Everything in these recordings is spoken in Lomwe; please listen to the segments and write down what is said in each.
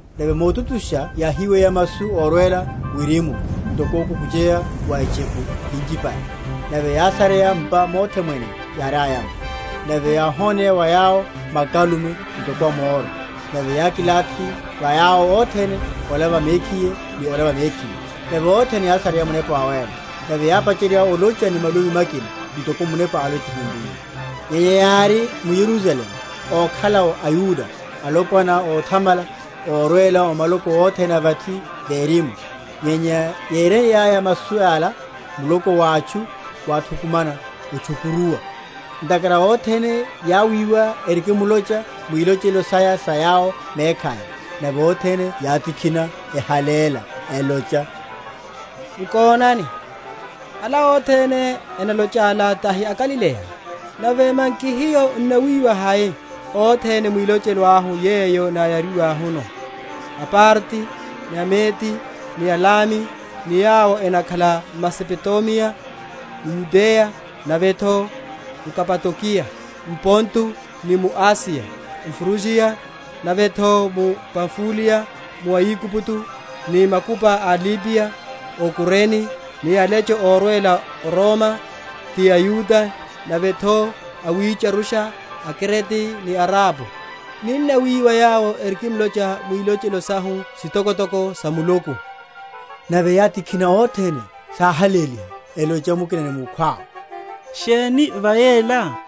Nave motutusha yáhíweya masu órwela wirimu ntoko okukucheya wa etcheku yinchipale, nave yásareya m’pa mothe mwene yáriaya’mo. Nave yáhoneya wa yawo makalume, ntoko a moro; nave yákilathi va yawo othene, ola va mekhiye ni ola va mekhiye. Nave othene yásareya Munepa Wawéla, nave yápacherya olocha ni malumi makina, ntoko Munepa álochiheryiye. Nyenya yári m’Yerusalemu ókhala’wo aYuda, alopwana óthamala, órwela o maloko othene a vathi verimu. Nyenya yéreiyaya masu ala, muloko wa atchu wáthukumana, otchukuruwa, ntakhara othene yawiwa erikimlocha mwilochelo saya sa yawo mekhaya. Nave othene yátikhina, ehaléla, elocha, Nkonani, Ala othene enalocha’la tahi aGalileya? nave manki hiyo n’nawiwa hai, othene mwilochelo ahu yeyo náyariwahuno? aParti ni aMedi, ni aElami, ni yawo enakhala m’Mesopotamiya, m’Yudeya, navetho m’Kapadokiya, m’Ponto, ni mu Asiya; m’Frugiya, nave’tho m’Pamfuliya, mu Aigupto, ni makupa a Libiya o Kurene, ni alecho órwela o Roma, ti aYuda, nave’tho awitcharusha, aKrete, ni aArabu, ninnawiwa yawo erikimlocha mwilochelo sahu sitokotoko sa Muluku. Nave yátikhina othene, sáhaléliha, elocha mukina ni mukhwawe, Sheni va yela?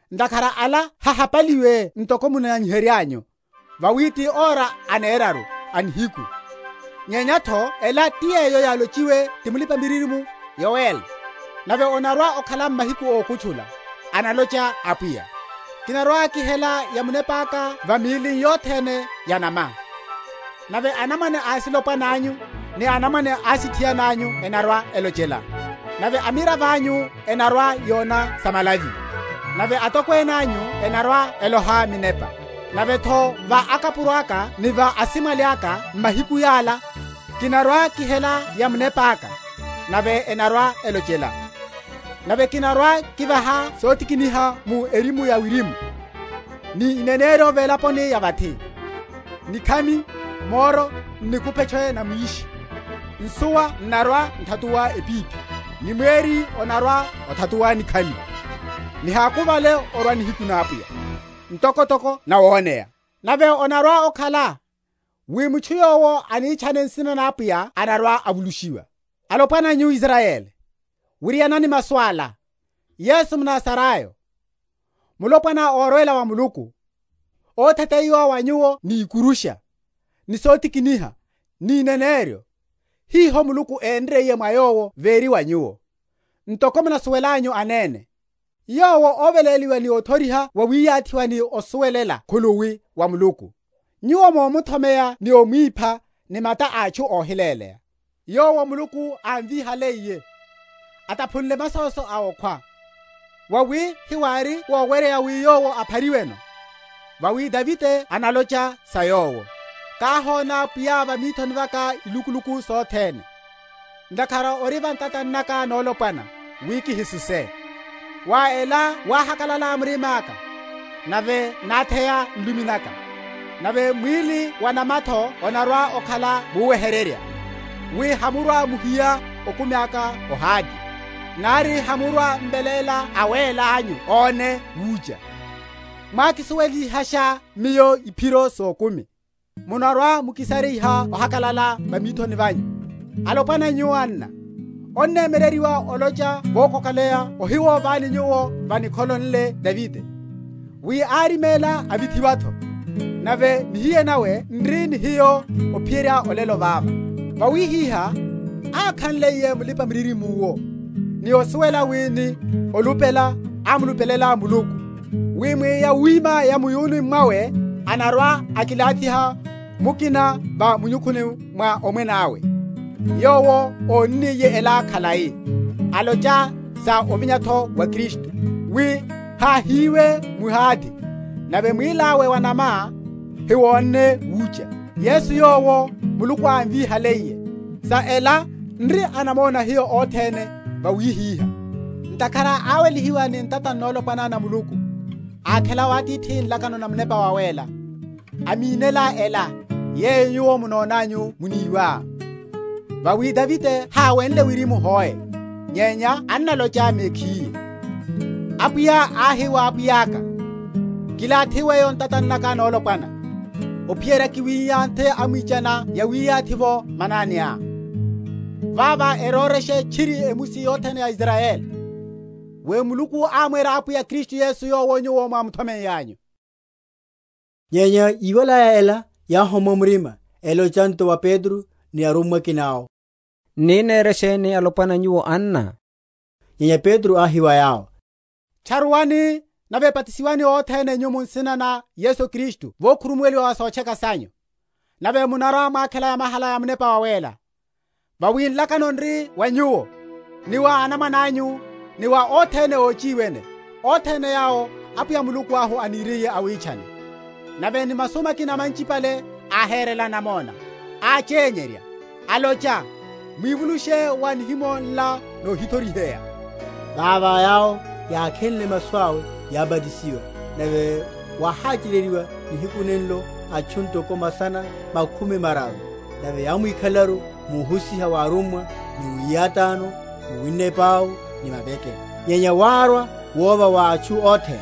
Ntakhara ala hehapaliwe ntoko munányihereryanyu; vawi ti ora aneraruru a nihiku; nyenya’tho ela ti yeyo yálochiwe ti mulipa‐miririmo Yoeli; Nave onarwa‐okhala m’mahiku ókutchula, analocha Apwiya, Kinarwa‐kihela ya Munepaka va míli yothene ya’nama, Nave anamwane asilopwana’nyu, ni anamwane asithiana’nyu enarwa‐elochela, Nave amiravo anyu enarwa‐yona samalavi, Nave atokwene anyu enarwa‐eloha minepa; Nave’tho va akapuro aka ni va asimwali aka m’mahiku yala Kinarwa‐kihela ya Munepa aka; nave enarwa‐elochela. Nave kinarwa‐kivaha sotikiniha mu erimu ya wirimu, Ni ineneryo velaponi ya vathi; Nikhami, moro, n’nikupetche na mwishi; Nsuwa n’narwa‐n’thatuwa epiphi, Ni mweri onarwa‐othatuwa nikhami, Nihákuvale orwa nihiku na Apwiya, N’tokotoko nawoneya; Nave onarwa‐okhala, wi mutchu yowo anitchane nsina na Apwiya anarwa‐avulushiwa. Alopwana nyu aIsrayeli, wirianani masu ala: Yesu mNazarayo, mulopwana órwela wa Muluku, ótheteyiwa wa nyuwo ni ikurusha, ni sotikiniha, ni ineneryo, hiho Muluku énriye mwa Yowo véri va nyuwo, ntoko munasuwelelanyu anene; Yowo, óveléliwa ni othoriha wawiyathiwa ni osuwelela khuluwi wa Muluku, nyuwo momuthomeya ni omwipha ni mata a atchu óhiléleya; Yowo Muluku ámvíhaliye, ataphunle masoso a okhwa, mwawi hewári woweryeya wi Yowo aphariweno. Vawi Davide analocha sa Yowo, Káhona Pwiya va mithoni vaka ilukuluku sothene; Ntakhara ori va ntatani naka nolopwana, wi kihisuse: Mwa ela wáhakalala murima’ka, nave nátheya nlumi naka; Nave mwíli wa’nama’tho onarwa‐okhala muwehererya. Wi hamurwa‐muhiya okumi aka o Hade, Nari hamurwa‐m’veléla Awéla anyu óne wucha, Mwákisuwelihasha miyo iphiro sokumi; Munarwa‐mukisariha ohakalala va mithoni vanyu. Alopwana nyu, anna, onnemyereryiwa olocha vokokoleya óhiwovani nyuwo sa nikholo nle Davide, wi áriméla avithiwa’tho, nave nihiye nawe n’ri ni hiyo ophiyerya olelo vava. Vawihiha, ákhanliye Mulipamiririmo yowo, ni osuwela wi ni olupela ámulupelela Muluku, wi mwa yawima ya mu’yununi mwawe anarwa‐akilathiha mukina va munyukhuni wa omwene awe; yowo ónniye ela khalai, alocha sa ovinya’tho wa Kristu, wi háhiyiwe m’Hade, nave mwíli awe wa’nama hawónne wucha. Yesu yowo, Muluku ámvihaliye; sa ela n’ri anamona hiyo othene Vawihiha, ntakhara áwelihiwa ni ntata nolopwana na Muluku, ákhela wa Atithi nlakano na Munepa Wawéla, amínela ela, yeyo nyuwo munonanyu muníwa. Vawi Davide háwenle wirimu hoe; nyenya annalocha mekhiye, Apwiya áhi wa Pwiya’ka, Kilathi weyo o ntatani naka nolopwana, Ophiyerya kiwiyanthe amwichaniá yawiyathi’vo mananiá. Vavo erorashe tchiri emusi yothene ya Israyeli, wi Muluku ámwera Apwiya Kristu Yesu yowo nyuwo mwámuthomeiyanyu. Ótcharuwa ópacherya. Nyenya yíwalaya ela, yáhommwa murima, elocha nto wa Petro ni arummwa akina awo, N’ni nere sheni alopwana nyu, anna? Nyenya Petro áhi wa yawo, Tcharuwani, nave batisiwani othene nyu mu nsina na Yesu Kristu vokhurumuweliwa wa sotcheka sanyu; nave munarwa‐mwakhela yamahala ya Munepa Wawéla. Vawi nlakano n’ri wa nyuwo, ni wa anamwane anyu, ni wa othene óchiwene, othene yawo Apwiya Muluku ahu aniriye awitchane. Nave ni masu makina manchipale áhérela namona, áchenyerya, alocha, Mwívulushe wa nihimo nla nohithoriheya. Vavo yawo yákhenle masu awe yábatisiwa; nave wáháchereryiwa nihiku nenlo atchu ntoko masana makhumi mararu. Nave yámwikhalelaru múhusiha wa arummwa ni mwiyátáno, mu winna epau ni mavekelo. Nyenya várwa wova va atchu othene;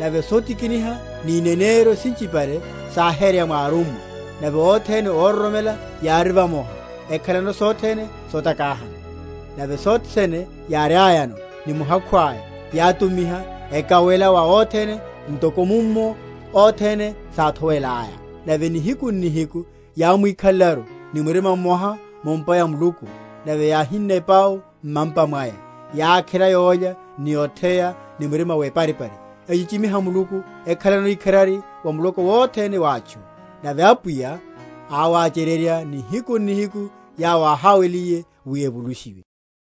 nave sotikiniha ni ineneryo sinchipale sáhereya mwa arummwa. Nave othene óroromela yári vamoha, ekhalano sothene sotakáhana. Nave sothe sene yáriayano, ni muhakhu aya, yátumiha, ekawela wa othene, ntoko mummo othene sáthowelaya. Nave nihiku n’nihiku yámwikhalelaru ni murima mmoha mu’mpa ya Muluku, nave yáhinna epau mmampa mwaya, yákhela yólya ni otheya, ni murima weparipari; echichimiha Muluku, ekhalano ikharari wa muloko wothene wa atchu. Nave Apwiya áwáchererya nihiku n’nihiku yawo áháweliye wi evulushiwe.